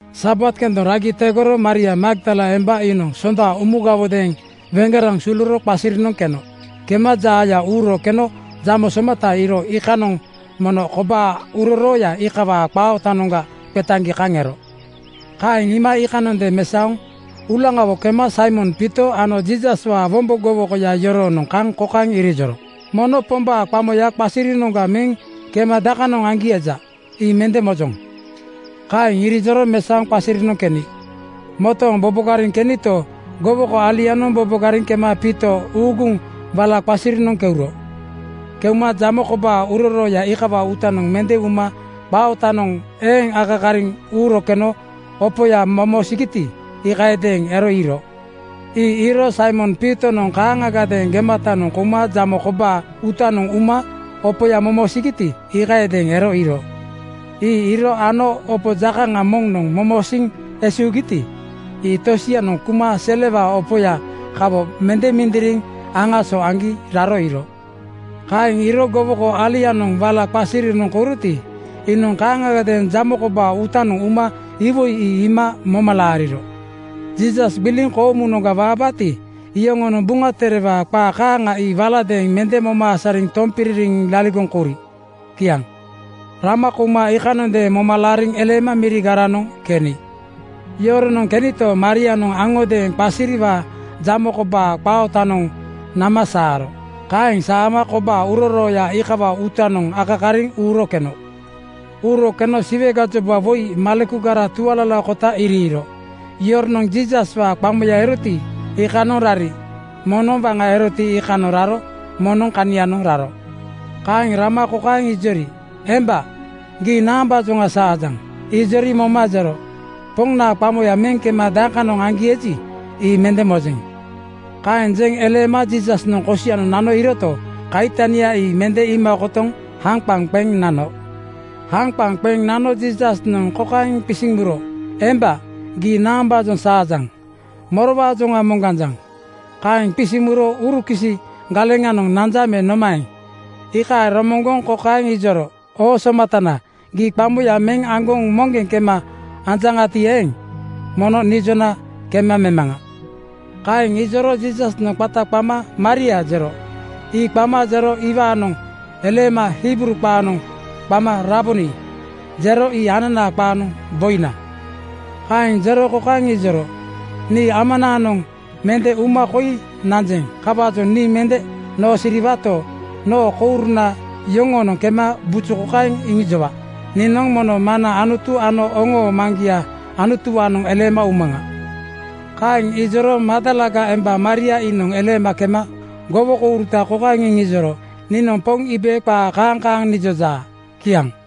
Sabat kendoŋ ragi tegoro Maria Magdala emba iinoŋ Sonda umugawodeeŋ weŋgeraŋ suluro qasirinoŋ keno. Kema jaaya uuro keno jamo somata iiro iikanoŋ mono kobaa urorooya iikawaa qaa ootanoŋga qetaŋgi kaŋ ero. Kaeŋ iima iikanondeeŋ mesaoŋ uulaŋawo kema Saimon Piito ano Jiisaswaa wombo gowokoya yoroonoŋ kaŋ kokaeŋ irijoro, “Mono Pombaa qamoya qasirinoŋga meŋ kema dakanoŋ aŋgi eji, ii mende mojoŋ.” Kaeŋ irijoro mesaoŋ qasirinoŋ keni. Motooŋ bobogariŋ kenito, gowoko alianoŋ bobogariŋ kema Piito uuguŋ wala qasirinoŋ keuro. Keuma jamo kobaa urorooya iikawaa uutanoŋ mende uma qaa ootanoŋ eeŋ akakariŋ uuro keno opoya momosigiti, iikayadeeŋ ero iiro. Ii iiro Saimon Piitonoŋ kaaŋagadeeŋ gematanoŋ kouma jamo kobaa uutanoŋ uma opoya momosigiti, iikayadeeŋ ero iiro. Ii iiro ano waŋa opo jakaŋa moŋnoŋ momosiiŋ esuugiti, ii tosianoŋ kuma selewaa opoya kawo mende mindiriŋ aŋaso aŋgi raro iiro. Kaeŋ iiro gowoko alianoŋ wala qasirinoŋ kouroti, iinoŋ kaaŋagadeeŋ jamo kobaa uutanoŋ uma iwoi ii iima moma laariro. Jiisas gbiliŋ koomunoŋga waabaati, iyoronoŋ Buŋa Terewaa qaa kaaŋa ii waladeeŋ mende moma asariŋ tompiririŋ laligoŋ kouri. Kiaŋ. Rama kouma iikanondeeŋ moma laariŋ eleema mirigaranoŋ keni. Yoronoŋ kenito, Marianoŋ aŋodeeŋ qasiriwaa jamo kobaa qaa ootanoŋ nama saaro. Kaeŋ saama kobaa urorooya iikawaa uutanoŋ akakariŋ uuro keno. Uuro keno Siwe gajoba woi malekugara tualalakota iriiro. Yoronoŋ Jiisaswaa qamoya eroti, iikanoŋ rari. Moŋnoŋ waŋa eroti, iikanoŋ raro moŋnoŋ kanianoŋ raro. Kaeŋ rama kokaeŋ ijori, “Emba, gii naambaajoŋa saajaŋ?” Ijori moma jero, “Poŋnaa qamoya meŋ kema dakanoŋ aŋgi eji, ii mende mojeŋ.” Kaeŋ jeŋ eleema Jiisasnoŋ kosianoŋ nano iiroto, kaitania ii mende iima kotoŋ haŋqaŋ qeŋ nano. Haŋqaŋ qeŋ nano Jiisasnoŋ kokaeŋ qisiŋ muro, “Emba, gii naambaajoŋa saajaŋ? Morowaajoŋa moŋganjaŋ?” Kaeŋ qisiŋ muro urukisi galeŋanoŋ nanja me nomaeŋ, iikaeŋ romoŋgoŋ kokaeŋ ijoro, “Oo somatana, gii qamoya meŋ aŋgoŋ moŋgeŋ kema anjaŋati eeŋ, mono nijona kema memaŋa.” Kaeŋ ijoro Jiisasnoŋ qata qama “Maria!” jero. Ii qama jero iwaanoŋ eleema Hibruu qaanoŋ qama “Raboni!” jero. Ii ananaa qaanoŋ “Boina!” Kaeŋ jero kokaeŋ ijoro, “Nii Amanaanoŋ mende uma koi nanjeŋ. Kawaajoŋ nii mende noosiriwato, noo kouruna yoŋoonoŋ kema buju kokaeŋ iŋijowa: Niinoŋ mono Maŋna Anutu ano oŋoo Maŋgia Anutuwaanoŋ eleema umaŋa.” Kaeŋ ijoro Magdalaga emba Maria iinoŋ eleema kema gowo-kouruta kokaeŋ iŋijoro, “Niinoŋ Poŋ iibe qaa kaaŋ kaaŋ nijojaa.” Kiaŋ.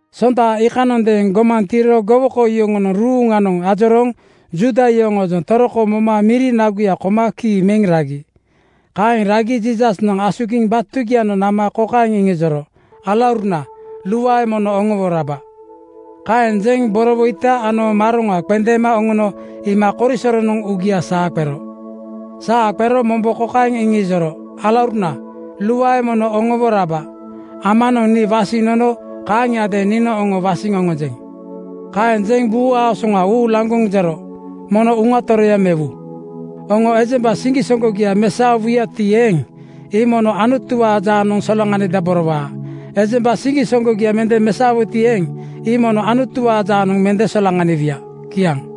Sonda iikanondeeŋ gomaŋ tiiro gowoko yoŋonoŋ ruuŋanoŋ ajorooŋ Juuda yoŋoojoŋ toroko moma miri naguya koma kii meŋ ragi. Kaeŋ ragi Jiisasnoŋ asugiŋ batugianoŋ nama kokaeŋ iŋijoro, “Alauruna, luae mono oŋowo raba!” Kaeŋ jeŋ borowoita ano maroŋa qendeema oŋono iima korisoronoŋ uugia saa qero. Saa qero mombo kokaeŋ iŋijoro, “Alauruna, luae mono oŋowo raba! Amanoŋ nii wasiŋ nono kaaŋiadeeŋ niinoŋ oŋo wasiŋ oŋonjeŋ.” Kaeŋ jeŋ buu aasoŋa uulaŋgoŋ jero, “Mono Uŋa Toroya mewu. Oŋo ejemba siŋgisoŋgogia mesaowuyati eeŋ, ii mono Anutuwaa jaanoŋ solaŋanidaborowaa. Ejemba siŋgisoŋgogia mende mesaowuti eeŋ, ii mono Anutuwaa jaanoŋ mende solaŋaniwuya.” Kiaŋ.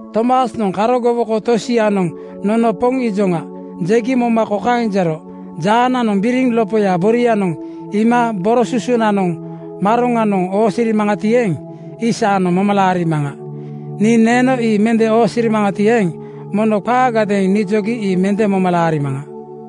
Tomasnoŋ karo gowoko tosianoŋ “Nono Poŋ iijoŋa,” jegi moma kokaeŋ jero, “Jaananoŋ biriŋ lopoya borianoŋ iima boro susunanoŋ maroŋanoŋ oosirimaŋati eeŋ, ii saanoŋ moma laarimaŋa. Nii neeno ii mende oosirimaŋati eeŋ, mono qaagadeeŋ nijogi ii mende moma laarimaŋa.”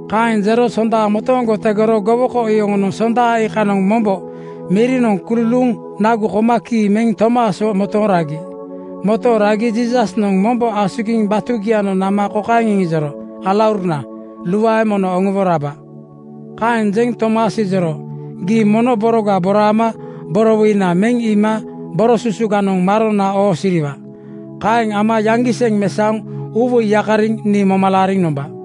Kaeŋ jero sonda motooŋgo tegoro gowoko yoŋonoŋ Sonda iikanoŋ mombo mirinoŋ kululuuŋ nagu koma kii meŋ Tomaswo motooŋ ragi. Motooŋ ragi Jiisasnoŋ mombo asugiŋ batugianoŋ nama kokaeŋ jero, “Alauruna, luae mono oŋowo raba!” Kaeŋ jeŋ Tomas ijoro, “Gii mono boroga boraama borowoina meŋ iima boro susuganoŋ maronanoŋ oosiriwa. Kaeŋ ama yaŋgiseŋ mesaoŋ uuwoiga yakariŋ nii moma laariŋ nomba.”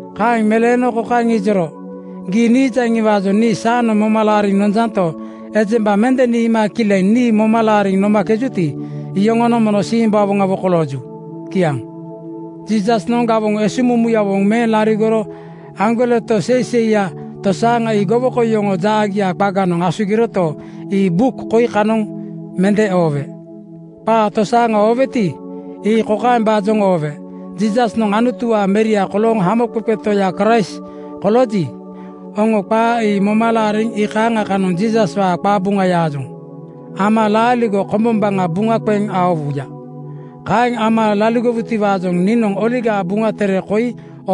Kaeŋ meleeno kokaeŋ ijoro, “Gii niijaŋiwaajoŋ nii saanoŋ moma laariŋ nonjanto, ejemba mende niima kileŋ nii moma laariŋ nomakejuti, iyoŋonoŋ mono simbawoŋawo kolooju.” Kiaŋ. Jiisasnoŋ gawoŋ esuŋmumuyawo meŋ laligoro aŋgoleto seiseiya tosaaŋa ii gowoko yoŋoo jaagia qaganoŋ asugiroto, ii buk koi kanoŋ mende oowe. Qaa tosaaŋa ooweti, ii kokaembaajoŋa oowe: Jiisasnoŋ Anutuwaa Meria kolooŋ Hamoqeqe Toya Kraist kolooji, oŋo qaa ii moma laariŋ iikaaŋa kanoŋ Jiisaswaa qabuŋayaajoŋ ama laaligo kombombaŋa buŋa qeŋ aowuya. Kaeŋ ama laligowutiwaajoŋ niinoŋ Oligaa Buŋa tere koi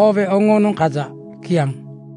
oowe oŋoonoŋ kaja. Kiaŋ.